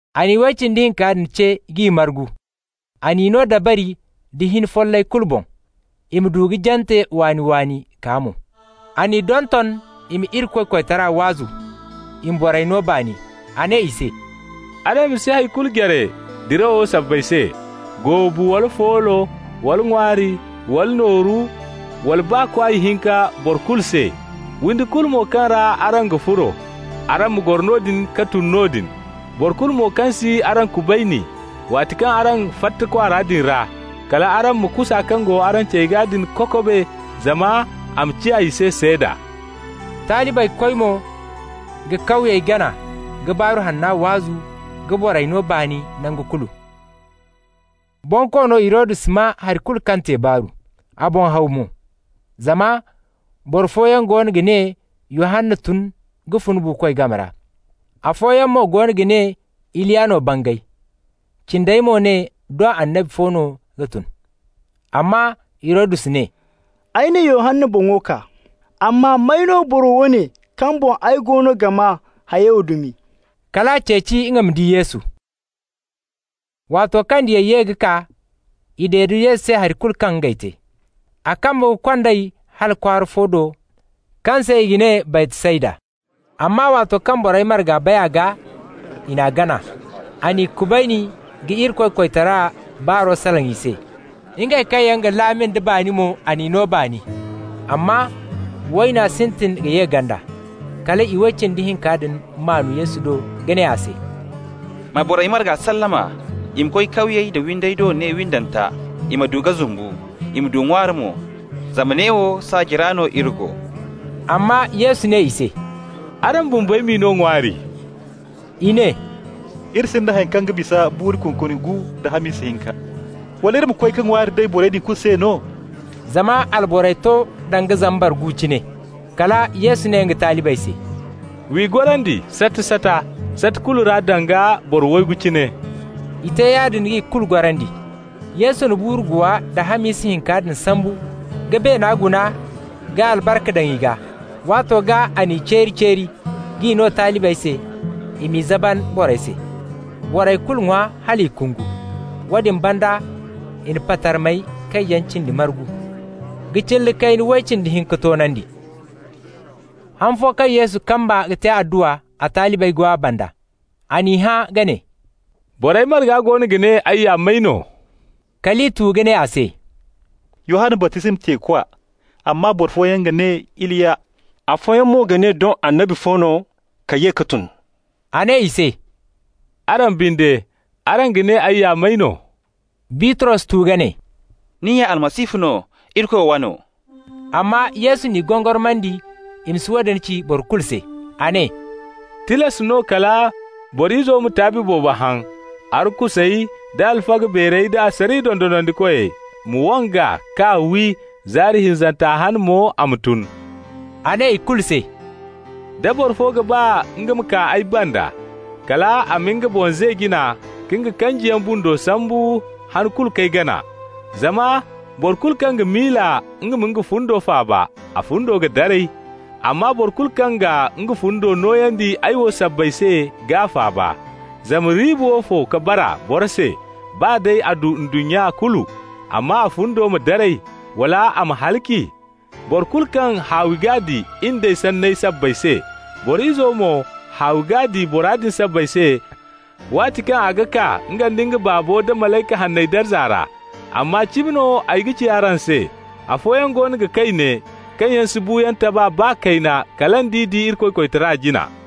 A na iway cindi hinka din ce k'i margu. A n'i no dabari da hin follay kulu boŋ, i ma du ka jante waani-waani kaa mo. A n'i donton i ma Irikoy koytara waazu, i ma borey no baani. A ne i se: «Araŋ ma si hay kulu jare dirawo sabbay se, goobu, wala foolo, wala ŋwaari, wala nooru, wala baa kwaay hinka boro kulu se. Windi kulu mo kaŋ ra araŋ ga furo, araŋ ma goro noodin ka tun noodin. Boro kulu mo kaŋ si araŋ kubayni, waati kaŋ araŋ fatta kwaara din ra, kal araŋ ma kusa kaŋ go araŋ cey gaa din kokobe, zama a ma ciya i se seeda.» Talibey koy mo ka kawyey gana ka Baaru Hanna waazu ka borey no baani nangu kulu. Bonkoono Hirodus maa hay kulu kaŋ te baaru. A boŋ haw mo, zama boro fooyaŋ goono ga ne Yohanna tun ka fun buukoy game ra. Afooyaŋ mo goono ga ne Iliya no bangay. Cindey mo ne doŋ annabi fo no ka tun. Amma Hirodus ne: «Ay na Yohanna boŋo kaa, amma may no boro woone kaŋ boŋ ay go ga maa hayey wo dumi?» Kal a ceeci nga ma di Yesu. Waato kaŋ diyey ye ka kaa, i dede Yesu se hay kulu kaŋ ngey te. A kamba ka kond'ey hala kwaara fo do kaŋ se i ga ne Baytsayda. Amma waato kaŋ borey marga bay a gaa, i n'a gana. A n'i kubayni ka Irikoy koytara baaro salaŋ i se. Ngey kaŋ yaŋ ga laami nda baani mo, a n'i no baani. Amma wayna sintin ka ye ganda. Kal iway cindi hinka din maan Yesu do ka ne a se: «Ma borey marga sallama, i ma koy kawyey da windey do ne windanta, i ma du ka zumbu, i ma du ŋwaari mo, zama neewo saaji ra no iri go.» Amma Yesu ne i se: «Araŋ bumbey m'i no ŋwaari.» I ne: «Iri sinda haŋ kaŋ ga bisa buuru kunkuni gu nda hamisa hinka. Wala iri ma koy ka ŋwaari day borey din kulu se no?» (Zama alborey to danga zambar gu cine.) Kala Yesu ne nga talibey se: «W'i gorandi sata-sata, sata kulu ra danga boro waygu cine.» I te yaadin k'i kulu gorandi. Yesu na buuru guwa da hamisa hinka din sambu ka beena guna ka albarka daŋ i gaa. Waato gaa a n'i ceeri-ceeri k'i no talibey se, i m'i zaban borey se. Borey kulu ŋwa hal i kungu. Woodin banda i na patarmey kaŋ yaŋ cindi margu, ka cilla kayna way cindi hinka toonandi. Han fo kaŋ Yesu kamba ka te adduwa, a talibey go a banda. A n'i hã ka ne: «Borey marga goono ga ne ay ya may no?» Kal i tu ka ne a se: «Yohanna baptisma teekwa. Amma boro fooyaŋ ga ne Iliya, afooyaŋ mo ga ne doŋ annabi fo no ka ye ka tun.» A ne i se: «Araŋ binde, araŋ ga ne ay ya may no?» Bitros tu ka ne: «Ni ya Almasihu no, Irikoy wano.» Amma Yesu n'i gongormandi i ma si woodin ci boro kulu se. A ne: «Tilas no kala Boro Izo ma taabi boobo haŋ, arkusey da alfaga beerey da asariya dondonandikoy ma wang'a k'a wi, zaari hinzanta hane mo a ma tun.» A ne i kulu se: «Da boro fo ga ba nga ma kaa ay banda, kal a ma nga boŋ ze jina, ka nga kanjiyaŋ bundo sambu han kulu k'ay gana. Zama boro kulu kaŋ ga miila nga ma nga fundo faaba, a fundo ga daray. Amma boro kulu kaŋ ga nga fundo nooyandi ay wo sabbay se g'a faaba. Zama riiba woofo ka bara boro se, baa day a du ndunnya kulu, amma a fundo ma daray, wala a ma halaci? Boro kulu kaŋ haawi g'a di in d'ay sanney sabbay se, Boro Izo mo, haawi g'a di bora din sabbay se waati kaŋ a ga kaa nga nda Baabo da malayka hanney darza ra. Amma cimi no ay ga ci araŋ se: afooyaŋ goono ga kay ne kaŋ yaŋ si buuyaŋ taba baa kayna kala nd'i di Irikoy koytara jina.»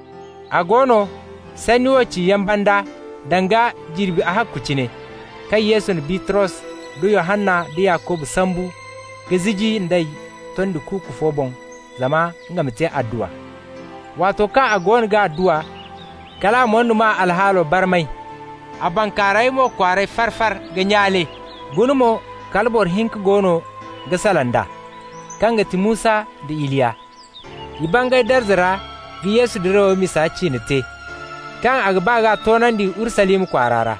A go no, sanni wo ciyaŋ banda, danga jirbi ahakku cine, kaŋ Yesu na Bitros da Yohanna da Yakuba sambu ka ziji nd'ey tondi kuuku fo boŋ zama nga ma te adduwa. Waato kaŋ a goono ga adduwa, kal a moyduma alhaalo barmay, a bankaaray mo kwaaray far-far ka nyaale. Guna mo, kala boro hinka goono ga salaŋ d'a, kaŋ ga ti Musa nda Iliya. I bangay darza ra ka Yesu dirawo misa ciine te, kaŋ a ga ba k'a toonandi Urusalima kwaara ra.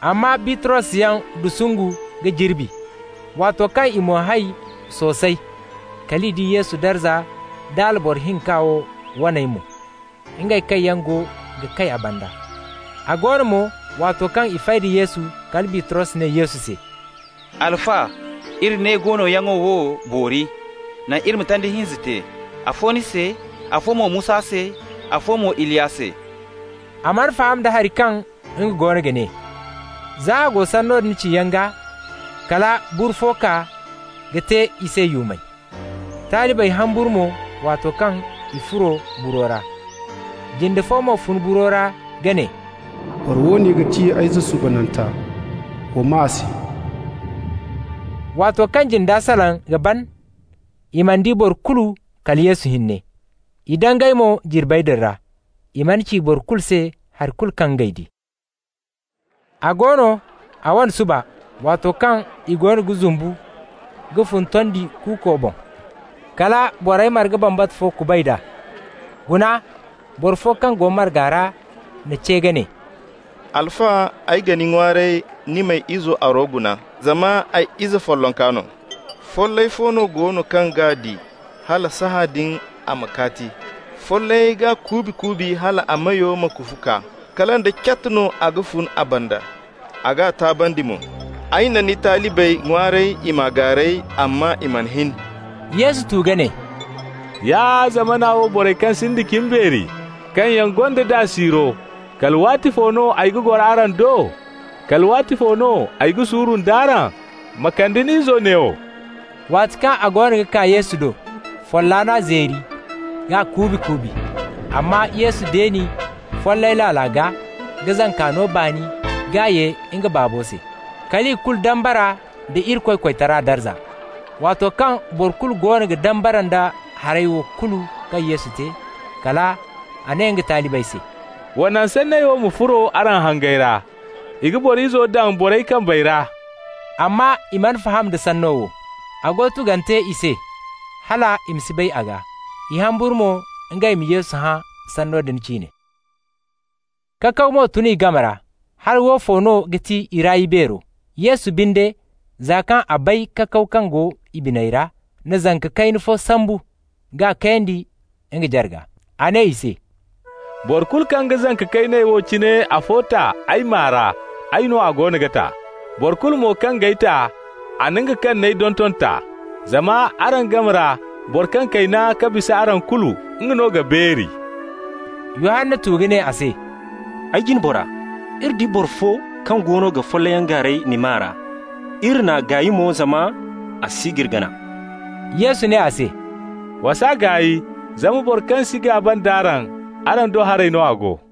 Amma Bitrosyaŋ dusungu ka jirbi. Waato kaŋ i moy hay soosay, kal i di Yesu darza da alboro hinka wo wane mo, ngey kaŋ yaŋ go ga kay a banda. A go no mo, waato kaŋ i fay da Yesu, kala Bitros ne Yesu se: «Alfa, iri ne goonoyaŋo wo boori. Naŋ iri ma tanda hinza te, afo ni se, afo mo Musa se, afo mo Iliya se.» (A mana faham da haŋ kaŋ nga goono ga ne.) Za a go sanno din ciyaŋ gaa, kala buru fo kaa ka te i se yuumay. Talibey humburu mo waato kaŋ i furo buro ra. Jinde fo mo fun buro ra ka ne: «Boro woone ga ti ay Izo suubananta. Wa maa a se.» Waato kaŋ jinda salaŋ ka ban, i mana di boro kulu kala Yesu hinne. I dangay mo jirbey din ra. I mana ci boro kulu se hay kulu kaŋ ngey di. A go no, a wane suba, waato kaŋ i goono ga zumbu ka fun tondi kuuko boŋ, kala borey marga bambata fo kuband'a. Guna, boro fo kaŋ go marga ra n'a ce ka ne: «Alfa, ay ga ni ŋwaaray, ni m'ay ize aro guna, zama ay ize follonka no. Follay fo go no kaŋ g'a di, hala sahãadin a ma kaati! Follay g'a kuubi-kuubi hal a meyo ma kufu kaa. Kala nda cat no a ga fun a banda, a g'a taabandi mo. Ay na ni talibey ŋwaaray i m'a gaaray, amma i mana hin.» Yesu tu ka ne: «Ya zamana wo borey kaŋ sinda cimbeeri, kaŋ yaŋ gonda daa siiro! Kala waatifo no ay ga goro araŋ do? Kala waatifo no ay ga suuru nd'araŋ? Ma kande ni izo neewo.» Waati kaŋ a goono ga kaa Yesu do, folla n'a zeeri k'a kuubi-kuubi. Amma Yesu deeni follay laala gaa, ka zanka no baani k'a ye nga baabo se. Kal i kulu dambara nda Irikoy koytara darza. Waato kaŋ boro kulu goono ga dambara nda hayey wo kulu kaŋ Yesu te, kal a ne nga talibey se: «Wa naŋ sanney wo ma furo araŋ hangey ra: I ga Boro Izo daŋ borey kambey ra.» Amma i mana faham da sanno wo. A go tugante i se hal i ma si bay a gaa. I humburu mo ngey ma Yesu hã sanno din ciine. Kakaw mo tun i game ra, hala woofo no ga ti i ra ibeero. Yesu binde, za kaŋ a bay kakaw kaŋ go i biney ra, na zanka kayna fo sambu k'a kayandi nga jarga. A ne i se: «Boro kulu kaŋ ga zanka kayney wo cine afo ta ay maa ra, ay no a goono ga ta. Boro kulu mo kaŋ g'ay ta, a na nga kaŋ n'ay donton ta. Zama araŋ game ra boro kaŋ kayna ka bisa araŋ kulu, nga no ga beeri.» Yohanna tu ka ne a se: «Ay jine bora, iri di boro fo kaŋ goono ga follayyaŋ gaaray ni maa ra. Iri n'a gaay mo, zama a si g'iri gana.» Yesu ne a se: «Wa s'a gaay, zama boro kaŋ si gaaba nd'araŋ, araŋ do haray no a go.»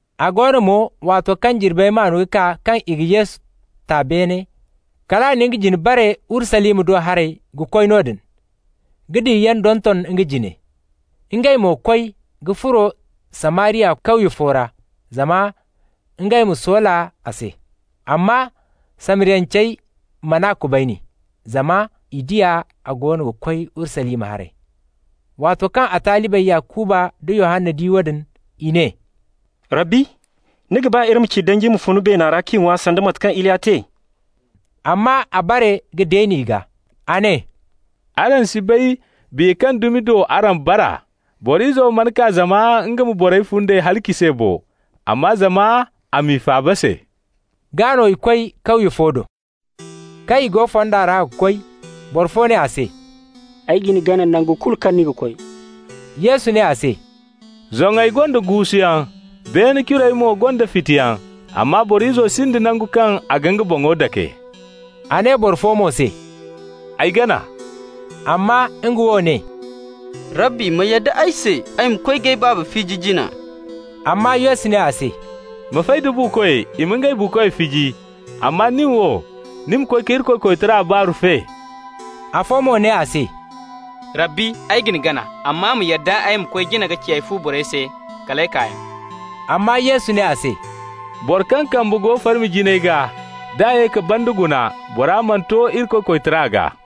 A go no mo, waato kaŋ jirbey maan ka kaa kaŋ i ga Yesu ta beene, kal a na nga jine bare Urusalima do haray ka koy noodin, ka diyayaŋ donton nga jine. Ngey mo koy ka furo Samariya kawye fo ra, zama ngey ma soola a se. Amma Samariyancey man'a kubayni, zama i di a goono ga koy Urusalima haray. Waato kaŋ a talibey Yakuba nda Yohanna di woodin, i ne: «Rabbi, ni ga ba iri ma ci danji ma fun beena ra k'i ŋwa, sanda mate kaŋ Iliya te?» Amma a bare ka deeni i gaa. A ne: «Araŋ si bay biya kaŋ dumi do araŋ bara. Boro Izo mana kaa zama nga ma borey fundey halaci se bo, amma zama a m'i faaba se.» Gaa no i koy kawye fo do. Kaŋ i go fonda ra ga koy, boro fo ne a se: «Ay ga ni gana nangu kulu kaŋ ni ga koy.» Yesu ne a se: «Zoŋey gonda guusuyaŋ, beene curey mo gonda fitiyaŋ, amma Boro Izo sinda nangu kaŋ a ga nga boŋo dake.» A ne boro fo mo se: «Ay gana.» Amma nga wo ne: «Rabbi, ma yadda ay se ay ma koy k'ay baaba fiji jina.» Amma Yesu ne a se: «Ma fay da buukoy i ma ngey buukoy fiji. Amma nin wo, ni ma koy ka Irikoy koytara baaru fe.» Afo mo ne a se: «Rabbi, ay ga ni gana, amma ma yadda ay ma koy jina ka ci ay fu borey se: ‹Kal ay kaayaŋ.›» Amma Yesu ne a se: «Boro kaŋ kamba go farmi jinay gaa, d'a ye ka banda guna, bora mana to Irikoy koytara gaa.»